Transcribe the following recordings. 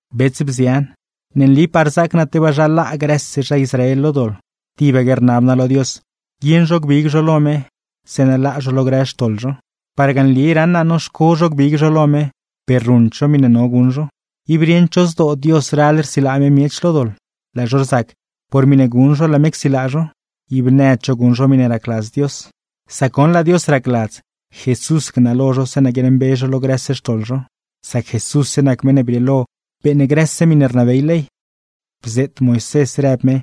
Bets, bzian, ne nlipaa rzaac naa tebaa zha laa grëse zha Israel lo doḻ, tibaque rnab naa lo Dios guieṉ zho gbig zho lo me, zeeṉa laa zho lo grë xtoḻ zho. Parga nli raṉ naa noxco zho gbig zho lo me; per ruṉd zho miṉe no guṉ zho. Ib rieṉd zho zdoo Dios ral rsilaa me miech lo doḻ, laa zho rzac por miṉe guṉ zho laa me csilaa zho. Ib nëd zho guṉ zho miṉe racladz Dios. Sac goṉ, laa Dios racladz Jesús gnalo zho zeeṉa guiaaṉmbe zho lo grëse xtoḻ zho; sac Jesússe nac meṉ ne brieelo beeṉ grëse miṉe rnabey ley. Bzeet Moisés rëb me,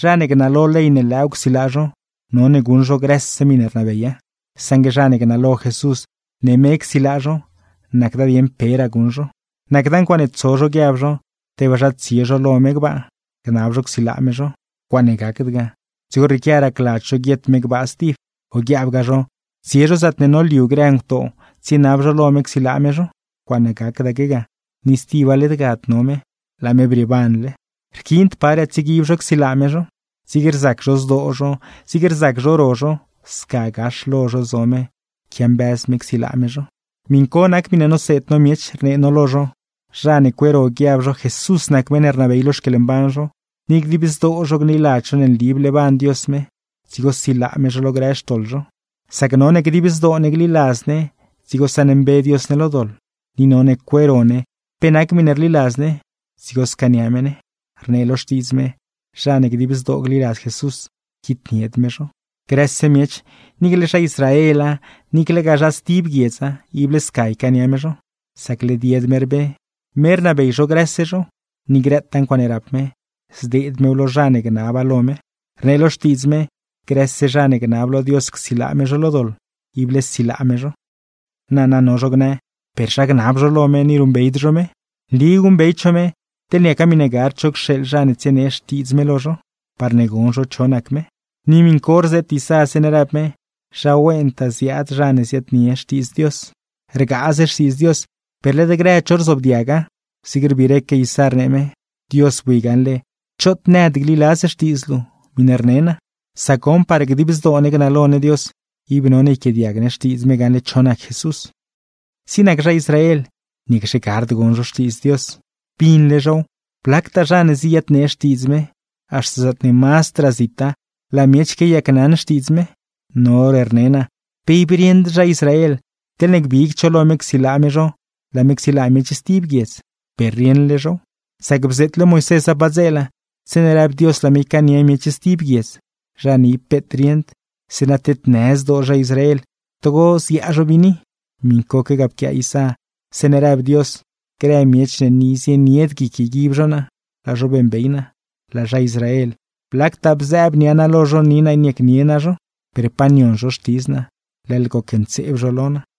zha ne gnalo ley ne lëëw csilaa zho, none guṉ zho grëse miṉe rnabeya; saṉgue zha ne gnalo Jesús ne me csilaa zho, nacda dieṉ peraa guṉ zho. Nacda ncuaaṉe tso zho guiab zho, tebaa zha tsie zho lo me gbaa, gnab zho csilaa me zho (ncuaaṉe gacda ga, dzigo rrieequia racladz zho guiet me ga stib); o guiaabgaa zho tsie zho zaatne noliu grë ngutoo, tsienab zho lo me csilaa me zho (ncuaaṉe gacdaque ga, ni stiba led gad no me, laa me brieebanle). Rquiind paraa tsieguib zho csilaa me zho, zig rzac zho zdoo zho, zig rzac zho ro zho, sca gax lo zho zo me quiambëz me csilaa me zho. Miṉ co nac miṉe noseed no miech, rnee no lo zho: Zha ne cueero guiab zho Jesús nac meṉ ne rnabey lo xquieḻmban zho, ni dib zdoo zho gliladz zho nli bleeban Dios me, dzigo silaa me zho lo grë xtoḻ zho. Sac none dib zdoo ne gliladz ne, dzigo saṉmbe Dios ne lo doḻ; ni none cueero ne pe nac miṉe rliladz ne, dzigo scaania me ne. Rnee lo Xtiidz me: “Zha ne dib zdoo gliladz Jesús, quitnied me zho.” Grëse miech, niicle zha Israela, niiclegaa zha stib guiedza ible sca ycaania me zho, sac led yed me rbe; me rnabey zho grëse zho, ni grëtaa ncuaaṉe rap me, zdeed mew lo zha ne gnaba lo me. Rnee lo Xtiidz me: “Grëse zha ne gnab lo Dios csilaa me zho lo doḻ, ible silaa me zho.” Nana, no zho gnë: ¿Per zha gnab zho lo me, ni ruṉbeyd zho me? Nli guṉbeyd zho me, teḻ niaca miṉe gard cho cxeeḻ zha ne tsienee Xtiidz me lo zho, parne gon zho cho nac me. Ni miṉ co rzeet Isá, zeeṉe rëb me: “¡Zha wentaa ziaad zha ne ziaadnie Xtiidz Ndzon Dios!” Rgaaz Xtiidz Dios, per led grëd zho rzoobdiaga, zig rbiireque Isá, rnee me: “Dios, bui gaṉle choot nëd gliladz Xtiidz luu, miṉe rne naa.” Sac goṉ, parne dib zdoo ne gnalo ne Dios, ib none yquiaadiag ne Xtiidz me gaṉle cho nac Jesús. Zig nac zha Israel, ¿niacxe gard gon zho Xtiidz Dios? ¡Binle zhow! Blactaa zha ne ziyadnee Xtiidz me, haxta zaatne mazdraa zita, laa miech quiayacnaṉ Xtiidz me. No hor rne naa: ¿Pe ib rieṉd zha Israel, teḻne gbigd zho lo me csilaa me zho, laa me csilaa miech stib guiedz? ¡Per rieṉle zhow! Sac bzeetle Moisésa padzeela, zeeṉe rëb Dios laa me ycaania miech stib guiedz, zha ne ib peet rieṉd; zeeṉa tednë zdoo zha Israel, togo ziaa zho biini. Miṉcoque ga pquiaa Isá, zeeṉe rëb Dios: Grë miech ne ni zienied guic yguib zho naa, laa zho beeṉbey naa. Laa zha Israel, blactaa bzëëb nia naa lo zho ni naa niacnie naa zho, per pa nion zho xtidz naa, leḻ gocntseeb zho lo naa.